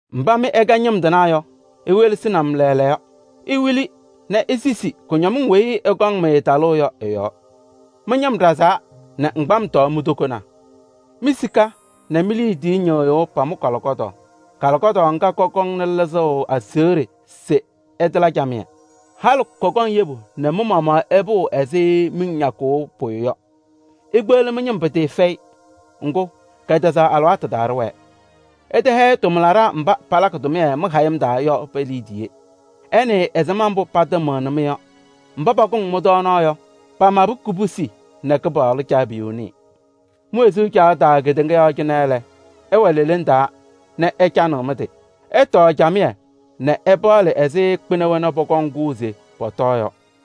Mbá mɩ ɩkɛ ñɩm tɩnaa yɔ, iwelesini-m lɛɛlɛɛyɔ! Iwili nɛ isisi kʋñɔmɩŋ weyi ɩkɔŋ-mɩ talʋʋ yɔ ɩ-yɔɔ! Mɩ-ñɩm ɖazaa nɛ ŋgbam tɔɔ mi-tokonaa. Mi-sika nɛ mi-liidiye ñɩ́ɣ́yʋ́ʋ pamʋ kálɩkɔ́daɣ. Kálɩkɔ́daɣ ŋ́gá kɔkɔŋnɩ lɩzʋʋ aseɣɖe se ɩtala camɩyɛ. Halɩ kɔkɔŋ yebu ɖɔɖɔ nɛ mɩ-maɣmaɣ ɩpʋʋ ɛzɩ miŋ ñakʋʋ pʋyʋ yɔ. Ikpeɣli ñɩm pɩtɩɩfɛyɩ, ŋgʋ́, kɛtɛzaɣ alɩwaatʋ taa ɖɩwɛɛ. Ɩtɛhɛyɩ tʋmlaɖaa mbá palakɩ tʋmɩyɛ mɩ-hayɩm taa yɔ pe-liidiye. Ɩnɩɩ ɛzɩma mbʋ́ patɩmɩɣnɩ-mɩ yɔ! Mbá pakʋŋ mɩ-tɔɔnaɣ yɔ, pamabɩ kobusi nɛ Kɩpaɣlʋ Caabiyuu nɩɩ. Mi-wezuu caɣʋ taa kedeŋa yɔɔ cɩnɛ lɛ, ɩwɛ leleŋ taa nɛ ɩcanɩɣ mɩ-tɩ. Ɩtɔɔ camɩyɛ nɛ ɩpaɣlɩ ɛzɩ kpɩna wena pɔkɔŋ kʋʋ se pɔtɔɔ yɔ.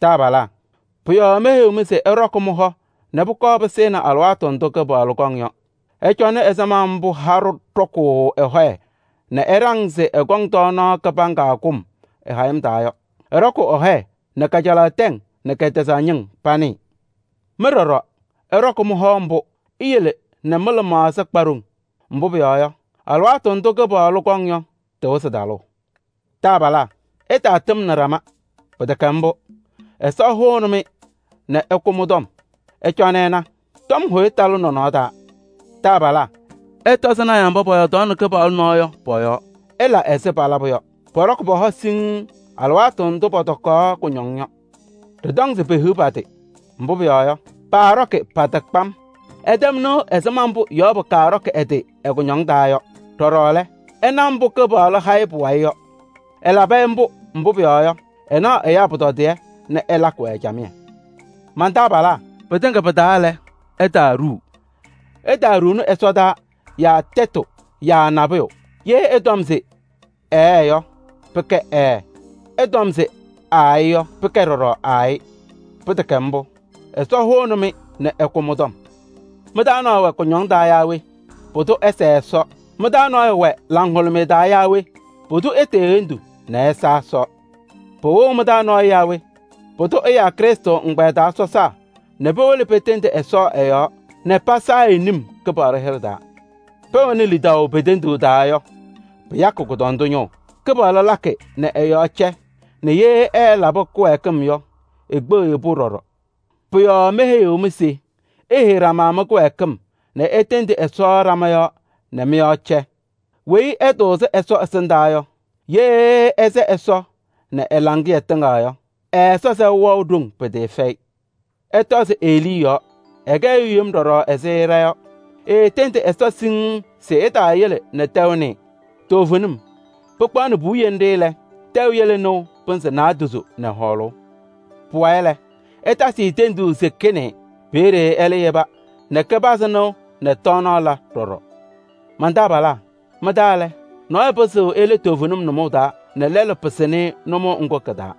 Taabalaa! Pʋ-yɔɔ meheyiɣ-mɩ se ɩɖɔkɩ mɩ-hɔ nɛ pʋkɔɔ pɩsɩɩnɩ alɩwaatʋ ndʋ́ Kɩpaɣlʋ kɔŋ yɔ. Ɩcɔnɩ ɛzɩma mbʋ́ haɖʋ ɖɔkʋʋ ɛ-hɔyɛ nɛ ɛɖaŋ se ɛkɔŋ tɔɔnaɣ kɩbaŋga kʋm ɛ-hayɩm taa yɔ: ɛɖɔkʋʋ ɛ-hɔyɛ nɛ kajalaɣ tɛŋ nɛ kɛtɛzaɣ ñɩŋ panɩɩ. Mɩ ɖɔɖɔ, ɩɖɔkɩ mɩ-hɔ ḿbʋ́, iyele nɛ mɩ-lɩmaɣza kpa ɖoŋ. Mbʋ́ pʋyɔɔ yɔ, alɩwaatʋ ndʋ́ Kɩpaɣlʋ kɔŋ yɔ, tɩwɩzɩ talʋʋ. Taabalaa! Ɩtaatɩmnɩ ɖama, pɩtɛkɛ ḿbʋ́, Ɛsɔ hʋʋnɩ-mɩ nɛ ɛkʋ mɩ-tɔm. Ɩcɔnɩ ɩna: tɔm hʋyʋ talɩ nɔnɔɔ taa! Taabalaa! Ɩtɔzɩ náyaa mbá pɔyɔɔdaɣnɩ Kɩpaɣlʋ nɔɔ yɔ pɔ-yɔɔ, ɩla ɛzɩ palabʋ yɔ. Pɔɖɔkɩ pɔ-hɔ siŋŋ alɩwaatʋ ndʋ́ pɔtɔkaɣ kʋñɔŋ yɔ. Đɩtɔŋ se pehiɣ pa-tɩ! Mbʋ́ pʋyɔɔ yɔ, paaɖɔkɩ pa-tɩ kpam. Ɩtɛm nɩʋ ɛzɩma mbʋ́ Yɔɔbʋ kɔɖɔkɩ ɛ-tɩ ɛ-kʋñɔŋ taa yɔ. Đɔɖɔ lɛ, ɩna mbʋ́ Kɩpaɣlʋ ha-ɩ pʋwayɩ yɔ. Ɛlabɩ-ɩ ḿbʋ́, mbʋ́ pʋyɔɔ yɔ, ɛnaɣ ɛyáa pʋtɔdɩyɛ nɛ ɛlakɩ-wɛ camɩyɛ. Man-taabalaa! Pɩtɩŋa pɩ-taa lɛ, ɩtaaɖuu: ɩtaaɖuuni ɛsɔdaa yaa tɛtʋ yaa nabʋyʋ. Yee ɩtɔm se: “Ɛɛ” yɔ, pɩkɛ “Ɛɛ.” Ɩtɔm se: “Aayɩ” yɔ, pɩkɛ ɖɔɖɔ “Aayɩ.” Pɩtɛkɛ ḿbʋ́, Ɛsɔ hʋʋnɩ-mɩ nɛ ɛkʋ mɩ-tɔm. Mɩ-taa nɔɔyʋ wɛ kʋñɔŋ taa yaa we? Pʋdʋ ɛsɛɛ Ɛsɔ. Mɩ-taa nɔɔyʋ wɛ laŋhʋlʋmɩyɛ taa yaa we? Pʋdʋ etee hendu nɛ ɛsa Ɛsɔ. Pɩwɩɣ mɩ-taa nɔɔyʋ yaa we? Pʋdʋ ɛ́yáa Krɩstʋ ŋgbɛyɛ taa sɔsaa nɛ powolo petendi Ɛsɔ ɛ-yɔɔ nɛ pasayɩ-ɩ num Kɩpaɣlʋ hɩɖɛ taa. Pɛwɛnɩ lidaʋ pe-tenduu taa yɔ, pɩyakɩ kʋdɔndʋ ñʋʋ: Kɩpaɣlʋ lakɩ nɛ ɛ-yɔɔ cɛ nɛ yee ɛɛlaba kɩwɛɛkɩm yɔ, ekpeɣ-i-pʋ ɖɔɖɔ. Pʋ-yɔɔ meheyiɣ-mɩ se iheyi ɖama mɩ-kɩwɛɛkɩm nɛ itendi Ɛsɔ ɖama yɔɔ nɛ mɩ-yɔɔ cɛ. Weyi ɛtʋʋzɩ Ɛsɔ ɛsɩndaa yɔ, yee ɛsɛ Ɛsɔ nɛ ɛ-laŋɩyɛ tɩŋa yɔ, ɛ-Ɛsɔ sɛʋ wɛɣ ɖoŋ pɩtɩɩfɛyɩ. Ɩtɔzɩ Elii yɔɔ, ɛkɛ ɛyʋ yem ɖɔɖɔ ɛzɩ ɖa yɔ: eetendi Ɛsɔ siŋŋ se ɛtaayele nɛ tɛʋ nɩɩ. Toovenim, pɩkpaɣnɩ puwiye ńɖɩ́ lɛ, tɛʋ yele nɩʋ pɩnzɩ naadozo nɛ hɔɔlʋʋ. Pʋwayɩ lɛ, ɛtasɩ-ɩ tenduu se kɩnɩɩ. Peeɖe ɛ́lɛ́ yeba nɛ kɩpazɩ nɩʋ nɛ tɔɔnaɣ la ɖɔɖɔ. Man-taabalaa! Mɩ-taa lɛ, nɔɔyʋ pɩzɩɣ ele toovenim nʋmɔʋ taa, nɛ lɛlʋ pɩsɩnɩ-ɩ nʋmɔʋ ŋ́gʋ́ kɩ-taa.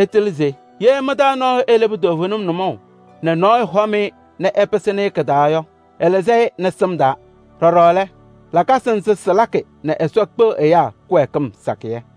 Ɩtɩlɩ se: yee mɩ-taa nɔɔyʋ eleba toovenim nʋmɔʋ nɛ nɔɔyʋ hɔm-ɩ nɛ ɛpɩsɩnɩ-ɩ kɩ-taa yɔ, ɛlɩzɩ-ɩ nɛ sɩm taa. Đɔɖɔ lɛ, lakasɩ ńzɩ́ sɩlakɩ nɛ Ɛsɔ kpeɣ ɛyáa kɩwɛɛkɩm sakɩyɛ.